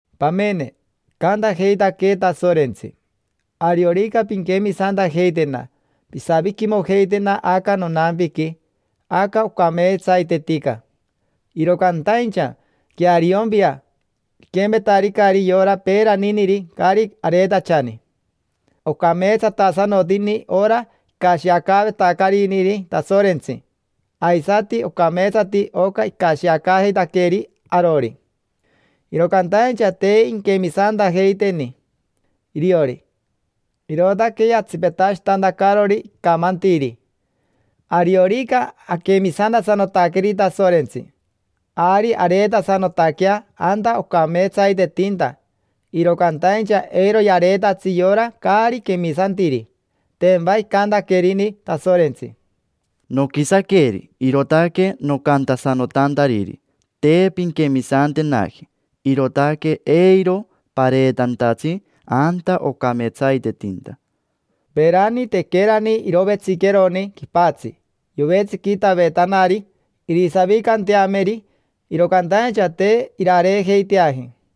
Pamene, icantajeitaquee Tasorentsi: “Ariorica pinquemisantajeitena pisaviquimojeitena aca nonampiqui, aca ocameetsaitetica”. Iro cantaincha queariompia, piquempetaricari yora peeraniniri caari areetachani. Ocameetsatasanotini ora icashiacaavetacariniri Tasorentsi, aisati ocameetsati oca icashiacaajeitaqueeri arori. Iro cantaincha te inquemisantajeiteni iriori, irootaque yatsipetashitantacarori icamantiri. Ariorica aquemisantasanotaqueri Tasorentsi, ari areetasanotaquea anta ocameetsaitetinta, iro cantaincha eiro yareetatsi yora caari quemisantiri. Tempa icantaquerini Tasorentsi: “Noquisaqueri, irootaque nocantasanotantariri: ‘Te pinquemisantenaji, irootaque eiro pareetantatsi anta ocameetsaitetinta’”. Peerani, tequerani irovetsiqueroni quipatsi, yovetsiquitavetanari irisavicanteameri, iro cantaincha te irareejeiteaji.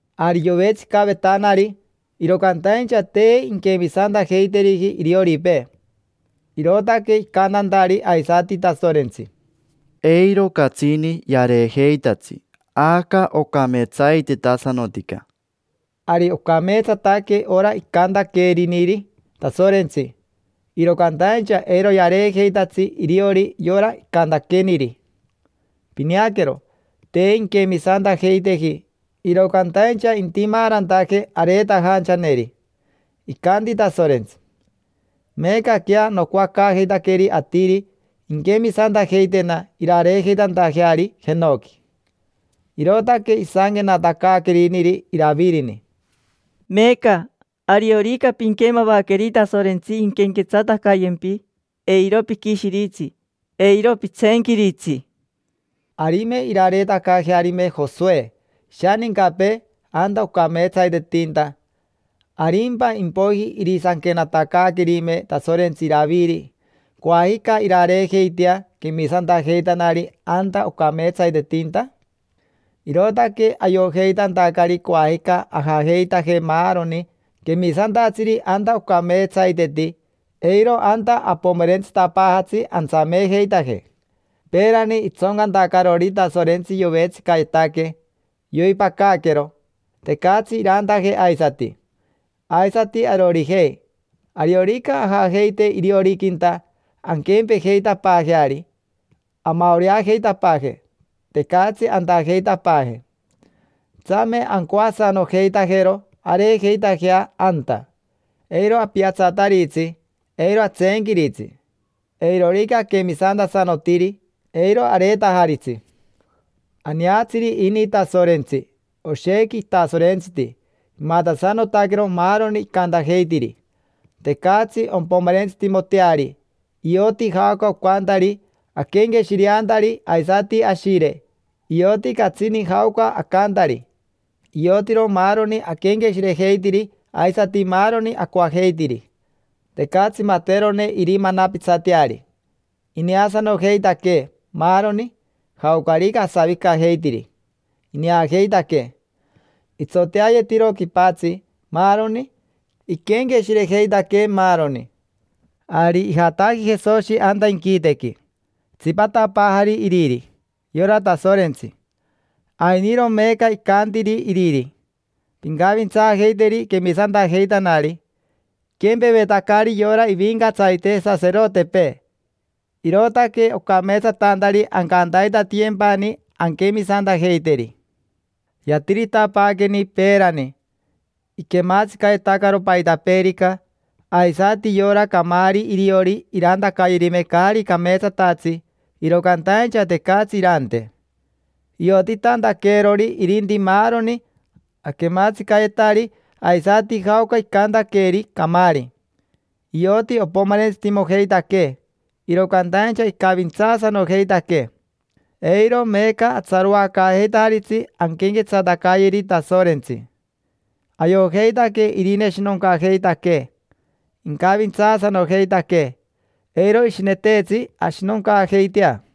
Ari yovetsicavetanari, iro cantaincha te inquemisantajeiteriji irioripee, irootaque icantantari aisati Tasorentsi: “Eiro catsini yareejeitatsi aca ocameetsaitetasanotica”. Ari ocameetsataque ora icantaqueriniri Tasorentsi, iro cantaincha eiro yareejeitatsi iriori yora icantaqueniri: pineaquero, te inquemisantajeiteji. Iro cantaincha intimaarantaje areetajanchaneri. Icanti Tasorentsi: “Meecaquea nocoacaajeitaqueri atiri inquemisantajeitena irareejeitantajeari jenoqui”. Irootaque isanquenatacaaqueriniri Iravirini: “Meeca, ariorica pinquemavaqueri Tasorentsi inquenquetsatacayempi, eiro piquishiritsi, eiro pitseenquiritsi”. Arime irareetacaajearime Josoe ishanincapee anta ocameetsaitetinta, ¿arimpa impoiji irisanquenatacaaquerime Tasorentsi Iraviri: “Coajica irareejeitea quemisantajeitanari anta ocameetsaitetinta”? Irootaque ayojeitantacari coajica ajajeitaje maaroni quemisantatsiri anta ocameetsaiteti, eiro anta apomerentsitapaajatsi antsameejeitaje. Peerani itsoncantacarori Tasorentsi yovetsicayetaque, yoipacaquero, tecatsi irantaje aisati. Aisati arorijei, ariorica ajajeite irioriquinta, anquempejeitapaajeari, amaoreajeitapaaje, tecatsi antajeitapaaje. Tsame ancoasanojeitajero areejeitajea anta: eiro apiatsataritsi, eiro atseenquiritsi. Eirorica aquemisantasanotiri, eiro areetajaritsi. Aneatsiri ini Tasorentsi, oshequi itasorentsiti; imatasanotaquero maaroni icantajeitiri. Tecatsi ompomerentsitimoteari, ioti jaoca ocantari aquenqueshireantari aisati ashire; ioti catsini jaoca acantari; iotiro maaroni aquenqueshirejeitiri aisati maaroni acoajeitiri. Tecatsi materone irimanapitsateari: ineasanojeitaquee maaroni; jaocarica asavicajeitiri, ineajeitaquee. Itsoteayetiro quipatsi, maaroni; iquenqueshirejeitaquee maaroni. Ari ijataji Jesoshi anta inquitequi, itsipatapaajari iriri, yora Tasorentsi. Ainiro meeca icantiri Iriri: “Pincavintsaajeiteri quemisantajeitanari”, iquempevetacari yora ivincatsarite saserotepee, irootaque ocameetsatantari ancantaitatiyempani anquemisantajeiteri. Yatiritapaaqueni peerani, iquematsicayetacaro paitapeerica, aisati yora caamari iriori irantacayerime caari cameetsatatsi, iro cantaincha tecatsi irante. Iotitantaqueerori irinti maaroni aquematsicayetari aisati jaoca icantaqueeri camaari. Ioti opomerentsitimojeitaquee, iro cantaincha icavintsaasanojeitaquee. Eiro meeca atsaroacaajeitajaritsi anquenquetsatacayeri Tasorentsi: ayojeitaque irineshinoncajeitaquee, incavintsaasanojeitaquee. Eiro ishineteetsi ashinoncaajeitea.